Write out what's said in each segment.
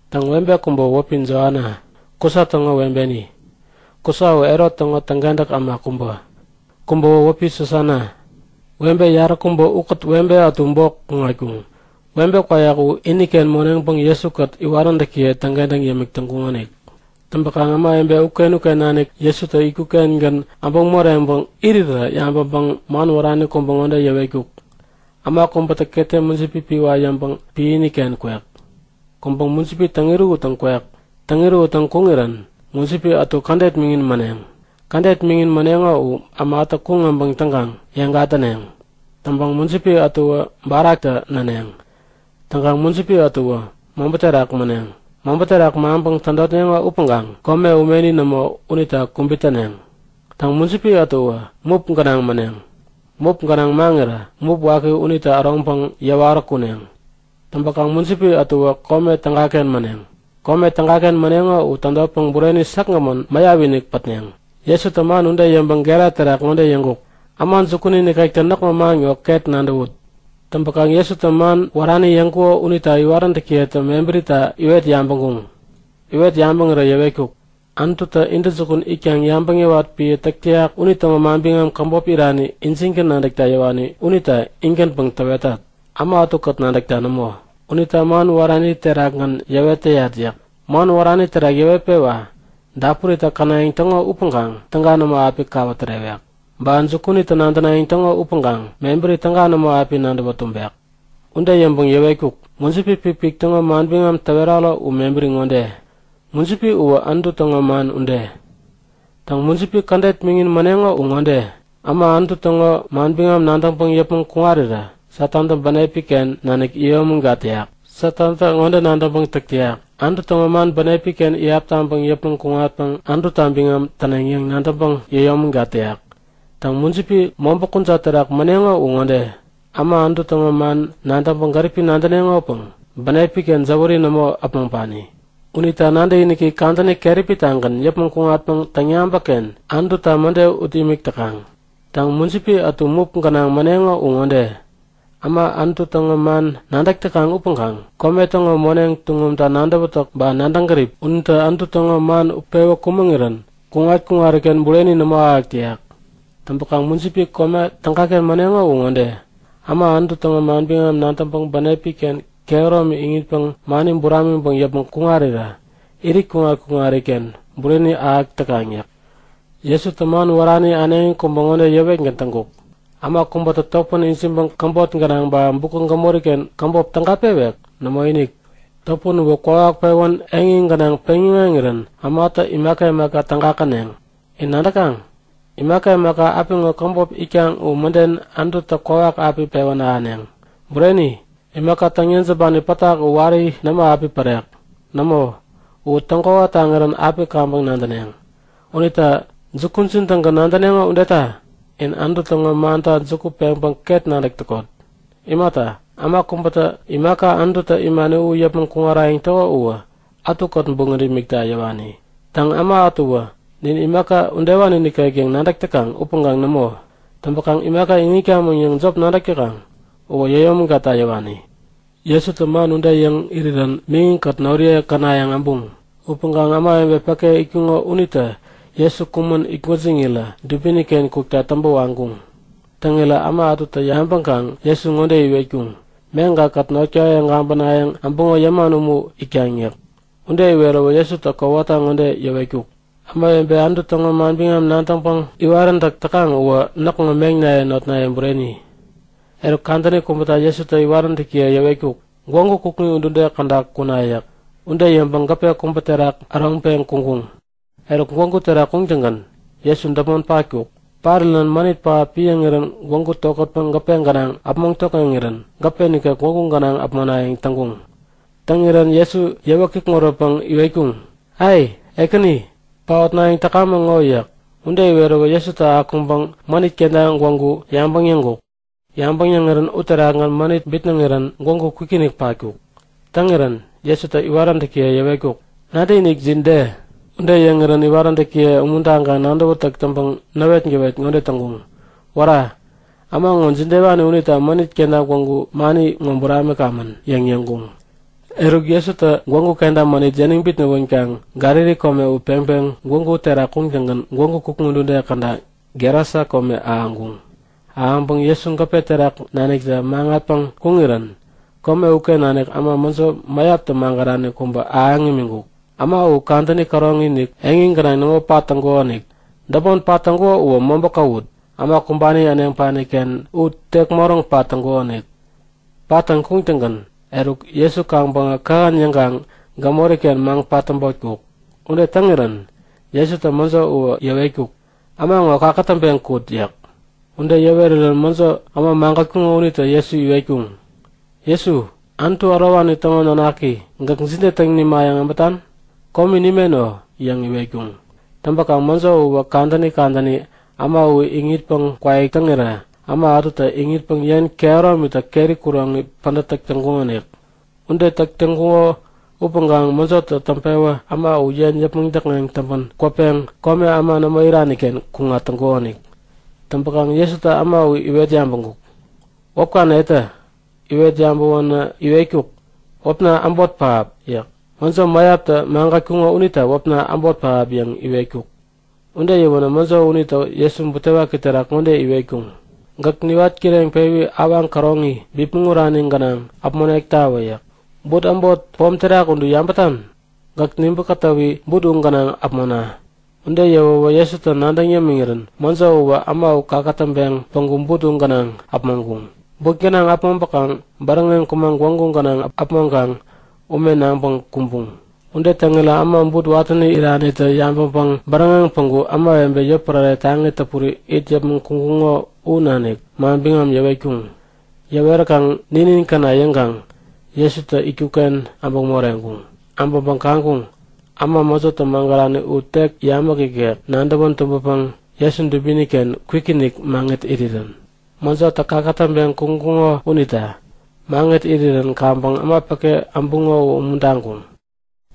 Täŋ, webe kubäwä wäpi Joana, Kusa täŋo webeni. (Kusa u Herot täŋo täŋkentäk äma kubä.) Kubäwä wäpi Susana. Webe yaräkubä ukät webe ätu bok kuŋatkuŋ. Webe kwayak uwä iniken moneŋpäŋ Jesu-kät iwaräntäkiye täŋkentäŋ yämik täŋkuŋonik. Täŋpäkaŋ ämawebe uken-uken nanik Jesutä itkuk-kengän äbäŋ moreŋpäŋ irirä yabäŋpäŋ man wärani kubä ŋode yäwetkuk; Äma kubätä ketem mujipi piwa yäŋpäŋ piäni-ken kwek. Kuŋpäŋ mujipi täŋ-irähuttäŋ kwek. Täŋ-irähuttäŋ kuŋirän mujipi ätu kädet miŋin mäneŋ. Kädet miŋin mäneŋo u ämatä kuŋ äbäŋ täŋkaŋ yeŋ gatäneŋ. Täŋpäkaŋ mujipi ätuwä baraktä näneŋ. Täŋkaŋ mujipi ätuwä mobä terak mäneŋ. Mobä terak maŋpäŋ tädotneŋo upäŋkaŋ kome umeni nämo unita kubit täneŋ. Täŋ, mujipi ätuwä mup gänaŋ mäneŋ. Mup gänaŋ maŋirä mup waki unitä äroŋpäŋ yäwarä kuneŋ. Täŋpäkaŋ mujipi ätuwä kome tägaken mäneŋ. Kome tägaken mäneŋo u tädotpäŋ bureni säkgämän mäyap-inik pätneŋ. Jesutä man ude yäŋpäŋ gera terak ŋode yäŋkuk; Äma jukuni nikektä näkŋo man ŋo ket nadäwut! Täŋpäkaŋ Jesutä man wärani yäŋkuko unita iwaräntäkiyetä mebärita iwet yabäŋkuŋ. Iwet yabäŋirä yäwetkuk; Anututä intäjukun itkaŋ yabäŋ yäwat piä täk täyak unitäŋo manbiŋam käbop irani injingän nadäkta yäwani unita in-gänpäŋ täwetat, äma ätukät nadäkta nämo. Unita man wärani terakgän yäwet täyat yäk. Man wärani terak yäwetpewa; Dapuritä känayäŋ täŋo upäŋkaŋ täga nämo api kawä tärewek. Ba jukunitä nadänayäŋ täŋo upäŋkaŋ mebäri täga nämo api nadäwä tumbek. Ude yäŋpäŋ yäwetkuk; Mujipi pikpik täŋo manbiŋam täweraro u mebäri ŋode; Mujipi uwä Anutu täŋo man ude. Täŋ, mujipi kädet miŋin mäneŋo u ŋode; Äma Anutu täŋo manbiŋam nadäŋpäŋ yäpmäŋ kuŋarirä Satantä bänepi-ken nanik yäyomägat täyak u. Satantä ŋode nadäŋpäŋ täk täyak; Anutu täŋo man bänepi-ken iyap taŋpäŋ yäpmäŋ kuŋatpäŋ Anututa biŋam täneŋ yäŋ nadäŋpäŋ yäyomägat täyak. Täŋ, mujipi mobä kujat terak mäneŋo u ŋode; Äma Anutu täŋo man nadäŋpäŋ gäripi nadäneŋopäŋ bänepi-ken jäwäri nämo äpmoŋpani. Unita nadäkiniki kadäni keräpi-tagän yäpmäŋ kuŋatpäŋ täŋyabäkken Anututa mäde ut imik täkaŋ. Täŋ, mujipi ätu mup gänaŋ mäneŋo u ŋode; Äma Anutu täŋo man nadäk täkaŋ upäŋkaŋ kome täŋo moneŋ tuŋumta nadäwätäk ba nadäŋ gärip unitä Anutu täŋo man utpewä kumäŋirän kuŋat-kuŋariken bureni nämo ahäk täyak. Täŋpäkaŋ mujipi kome tägaken mäneŋo u ŋode; Äma Anutu täŋo manbiŋam nadäŋpäŋ bänepi-ken kehäromi iŋitpäŋ mani buramiŋpäŋ yäpmäŋ kuŋarirä irit kuŋat-kuŋariken bureni ahäk täkaŋ yäk. Jesutä man wärani äneŋi kubä ŋode yäwetgän täŋkuk; Äma kubätä topän ijiŋpäŋ käbot gänaŋ ba bukä gämori-ken käbop täga pewek? Nämoinik! Topän uwä kwawak pewän eŋi gänaŋ peŋ-yäŋeŋirän ämatä imaka imaka täga käneŋ. In nadäkaŋ? Imaka imaka apiŋo käbop itkaŋ u mäden Anututä kwawak api pewän ahäneŋ. Bureni, imaka täŋ-yejämbani pätak u wari nämo api pärek. Nämo, u täŋkwawa taŋirän api kaŋpäŋ nadäneŋ. Unita jukujin-tägän nadäneŋo udeta in Anutu täŋo manta juku peŋpäŋ ket nadäk täkot. Imata, äma kubätä imaka Anututä imani u yäpmäŋ kuŋarayäŋ täko uwä ätukät buŋät imikta yäwani. Täŋ, äma ätuwä nin imaka udewani nikek yäŋ nadäk täkaŋ upäŋkaŋ nämo! Täŋpäkaŋ imaka iŋitkamäŋ yäŋ jop nadäk täkaŋ uwä yäyomägatta yäwani. Jesutä man ude yäŋ irirän miŋi-kät noriye känayäŋ äbuŋ. Upäŋkaŋ ämawebe päke itkuŋo unitä Jesu kumän itgwäjiŋirä dubini-ken kukta täŋpä waŋkuŋ. Täŋirä äma ätutä yabäŋkaŋ Jesu ŋode iwetkuŋ; Meŋka-kät notkaye gabänayäŋ äbäŋo yäman umu itkaŋ yäk. Ude iweräwä Jesutä kowata ŋode yäwetkuk; Ämawebe Anutu täŋo manbiŋam nadäŋpäŋ iwaräntäk täkaŋ uwä näkŋo meŋnaye notnaye bureni! Eruk, kadäni kubäta Jesutä iwaräntäkiye yäwetkuk; Gwägu kukŋi udude käda kuna yäk. Ude yäŋpäŋ gäpe kubä terak äroŋpeŋ kuŋkuŋ. Eruk gwägu terak kuŋtäŋgän Jesu däpmon patkuk. Parirän mänit pähap piäŋirän gwägu tokätpäŋ gäpe gänaŋ äpmoŋ tokŋeŋirän gäpe nikek gwägu gänaŋ äpmonayäŋ täŋkuŋ. Täŋirän Jesu yäwä kikŋuränpäŋ iwetkuŋ; Ai! Ekäni! Paotnayäŋ täkamäŋ ŋo! yäk. Ude iweräwä Jesutä akuŋpäŋ mänit kenta gwägu yabäŋ yäŋkuk. Yabäŋ yäŋirän uterakgän mänit bitnäŋirän gwägu kwikinik patkuk. Täŋirän Jesutä iwaräntäkiye yäwetkuk; Nadäkinikjin de? Ude yäŋirän iwaräntäkiye umuntaŋkaŋ nadäwätäk täŋpäŋ näwetgäwet ŋode täŋkuŋ; Wära! Äma ŋo jidewani unita mänit kenta gwägu mani ŋo buramikamän? yäŋ yäŋkuŋ. Eruk Jesutä gwägu kenta mänit yäniŋ bitnäwänkaŋ Galili kome u peŋpeŋ gwägu terak kuŋtäŋgän gwägu kukŋi udude käda Gerasa kome ahäŋkuŋ. Ahäŋpäŋ Jesu gäpe terak naniktä maŋatpeŋ kuŋirän kome uken nanik äma mäjo mäyaptä magärani kubätä ahäŋ imiŋkuk. Äma uwä kadäni käroŋi-inik eŋi gänaŋ nämo pat täŋkukonik. Däpmon pat täŋkuko uwä mobä kawut, äma kumbani äneŋpani-ken u tek moräŋ pat täŋkukonik. Pattäŋ kuŋattäŋgän eruk Jesu kaŋpäŋä kähän yäŋkaŋ gämori-ken maŋ-patäbotkuk. Ude täŋirän Jesutä mäjo uwä yäwetkuk; Äma ŋo kakätäŋpeŋ kut yäk. Ude yäwerirän mäjo äma magätkuŋo unitä Jesu iwetkuŋ; Jesu, Anutu Ärowani täŋo nanaki, gäk jide täŋ nimayäŋ äbätan? Komi nimeno! yäŋ iwetkuŋ. Täŋpäkaŋ mäjo uwä kadäni kadäni äma u iŋitpäŋ kwaik täŋirä äma ätutä iŋitpäŋ yen kehäromitä keri kuroŋi pädät täk täŋkuŋonik. Ude täk täŋkuŋo upäŋkaŋ mäjotä täŋpewä äma u yen yäpmäŋ däkŋeŋ täŋpän kwäpeŋ kome äma nämo irani-ken kuŋat täŋkukonik. Täŋpäkaŋ Jesutä äma u iwet yabäŋkuk; Wäpka netä? Iwet yabäwän iwetkuk; Wäpna “Äbot pähap” yäk. (Mäjo mäyaptä magätkuŋo unita wäpna Äbot pähap yäŋ iwetkuk.) Ude yäwänä mäjo unitä Jesu butewaki terak ŋode iwetkuŋ; Gäk niwat kireŋpewi awaŋ käroŋi, bipmäŋ urani gänaŋ äpmonektawä! yäk. But äbot pom terak udu yabätan? Gäk nibä-kätäwi but u gänaŋ äpmona! Ude yäwäwä Jesutä nadäŋ yämiŋirän mäjo uwä äma u kakätäŋpeŋ päŋku but gänaŋ äpmoŋkuŋ. But gänaŋ äpmoŋpäkaŋ bäräŋeŋ kumaŋ gwägu gänaŋ äpmoŋkaŋ ume naŋpäŋ kumbuŋ. Ude täŋirä äma but watäni iranitä yabäŋpäŋ bäräŋeŋ päŋku ämawebe yotpärare taŋi täpuri it yäpmäŋ kuŋkuŋo u nanik manbiŋam yäwetkuŋ. Yäweräkaŋ ninin käna yäŋkaŋ Jesutä itkuk-ken äbäŋ moreŋkuŋ. Äbäŋpäŋ kaŋkuŋ; Äma mäjotä magärani u tek yamäk ikek, nadäwän tumbäpäŋ Jesu dubini-ken kwikinik maŋit irirän. Mäjotä kakätäŋpeŋ kuŋkuŋo unita. Maŋit irirän kaŋpäŋ äma päke äbuŋo u umuntaŋkuŋ.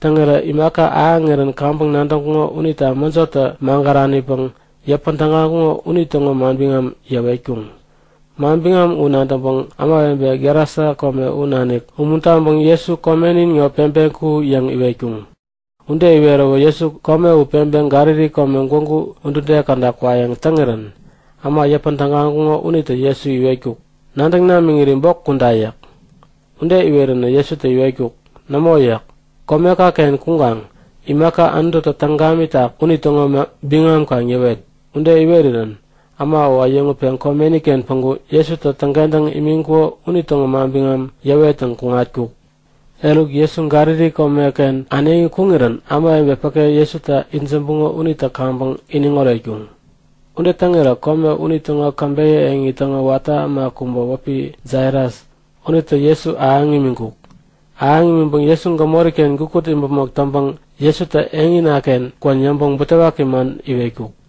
Täŋirä imaka ahäŋirän kaŋpäŋ nadäŋkuŋo unitä mäjotä magäranipäŋ yäpän tägaŋkuko unitäŋo manbiŋam yäwetkuŋ. Manbiŋam u nadäŋpäŋ ämawebe Gerasa kome u nanik umuntaŋpäŋ Jesu komenin ŋo peŋpeŋ ku! yäŋ iwetkuŋ. Ude iweräwä Jesu kome u peŋpeŋ Galili kome gwägu udude käda kwayäŋ täŋirän äma yäpän tägaŋkuŋo unitä Jesu iwetkuk; Nadäŋ namiŋiri bok kuda! yäk. Ude iweränä Jesutä iwetkuk; Nämo yäk. Komeka-ken kuŋkaŋ imaka Anututä täŋ gamitak unitäŋo biŋam kaŋ yäwet! Ude iwerirän äma u äyäŋutpeŋ komeni-ken päŋku Jesutä täŋkentäŋ imiŋkuko unitäŋo manbiŋam yäwettäŋ kuŋatkuk. Eruk, Jesu Galili komeken äneŋi kuŋirän ämawebe päke Jesuta itsämbuŋo unitä kaŋpäŋ iniŋ oretkuŋ. Ude täŋirä kome unitäŋo käbeyä eŋi täŋo watä äma kubä wäpi Jairas unitä Jesu ahäŋ imiŋkuk. Ahäŋ imiŋpäŋ Jesu gämori-ken gukut imäpmok täŋpäŋ Jesutä eŋina-ken kwän yäŋpäŋ butewaki man iwetkuk.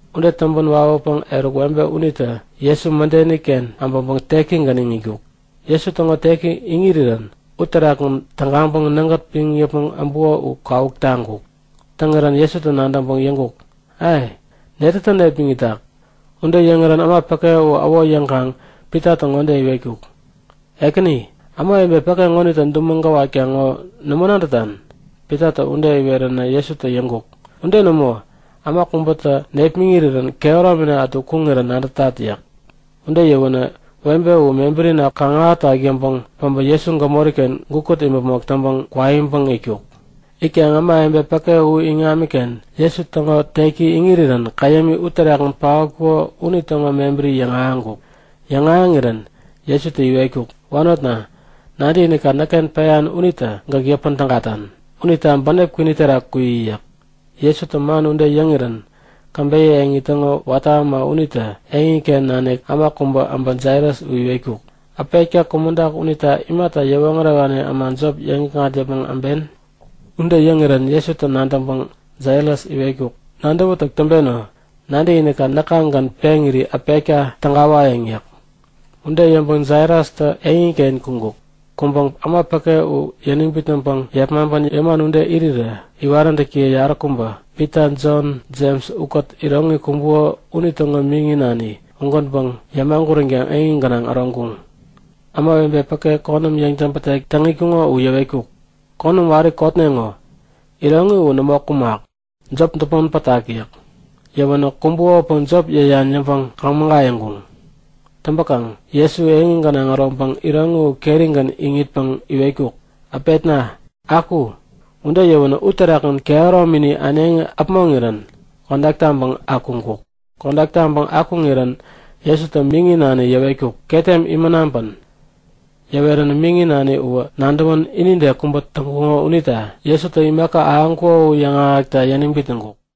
Ude täŋpän wawäpäŋ eruk webe unitä Jesu mädeni-ken äbäŋpäŋ tekigän iŋitkuk. Jesu täŋo teki iŋirirän uterakgän tägaŋpäŋ nägät piŋ yäpmäŋ äbuko u kawuk taŋkuk. Täŋirän Jesutä nadäŋpäŋ yäŋkuk; Ai! Netätä nepmäŋitak? Ude yäŋirän äma päke u äwo yäwäkaŋ Pitatä ŋode iwetkuk; Ekäni, ämawebe päke ŋonitä dumäŋ gäwatkaŋ ŋo nämo nadätan? Pitatä ude iweränä Jesutä yäŋkuk; Ude nämo! Äma kubätä nepmäŋirän kehäromina ätu kuŋirän nadätat yäk. Ude yäwänä webe u mebärina kaŋ-ahätak yäŋpäŋ päbä Jesu gämori-ken gukut imäpmok täŋpäŋ kwaiŋpäŋ itkuk. Itkaŋ ämawebe päke u iŋamiken Jesu täŋo tek iŋirirän käyämi uterakgän paotkuko unitäŋo mebäri yäŋahäŋkuk. Yäŋahäŋirän Jesutä iwetkuk; Wanotna, nadäkinikka näkken peyan unitä gäk yäpän tägatan. Unita bänep kwini terak kuyi yäk. Jesutä man ude yäŋirän käbeyä eŋi täŋo watä äma unitä eŋiken nanik äma kubä äbä Jairas u iwetkuk; Äpetka kumäŋtak unita imata yäwoŋärewani äma jop yäŋikŋat yäpmäŋ äben? Ude yäŋirän Jesutä nadäŋpäŋ Jairas iwetkuk; Nadäwätak täŋpeno! Nadäkinikka näkagän peŋiri äpetka tägawayäŋ yäk. Ude yäŋpäŋ Jairastä eŋiken kuŋkuŋ. Kuŋpäŋ äma päke u yäniŋ bitnäŋpäŋ yepmaŋpän yäman ude irirä iwaräntäkiye yaräkubä Pita, Jon, Jems ukät iroŋi kumbuko unitäŋo miŋi nani ugänpäŋ yämaguränkaŋ eŋi gänaŋ äroŋkuŋ. Ämawebe päke konäm yäŋtäbätek täŋ itkuŋo u yäwetkuk; Konäm wari kotneŋo. Iroŋi u nämo kumak. Jop däpmon pätak yäk. Yäwänä kumakopäŋ jop yäyan yäŋpäŋ kaŋ-mägayäŋkuŋ. Täŋpäkaŋ Jesu eŋi gänaŋ äroŋpäŋ iroŋi u kerigän iŋitpäŋ iwetkuk; Äpetna, aku! Ude yäwänä uterakgän kehäromini äneŋi äpmoŋirän kodak taŋpäŋ akuŋkuk. Kodak taŋpäŋ akuŋirän Jesutä miŋi nani yäwetkuk; Ketem imän naŋpän! Yäweränä miŋi nani uwä nadäwän inide kubä täŋkuko unita Jesutä imaka ahäŋkuko u yäŋahäkta yäniŋ bitnäŋkuk.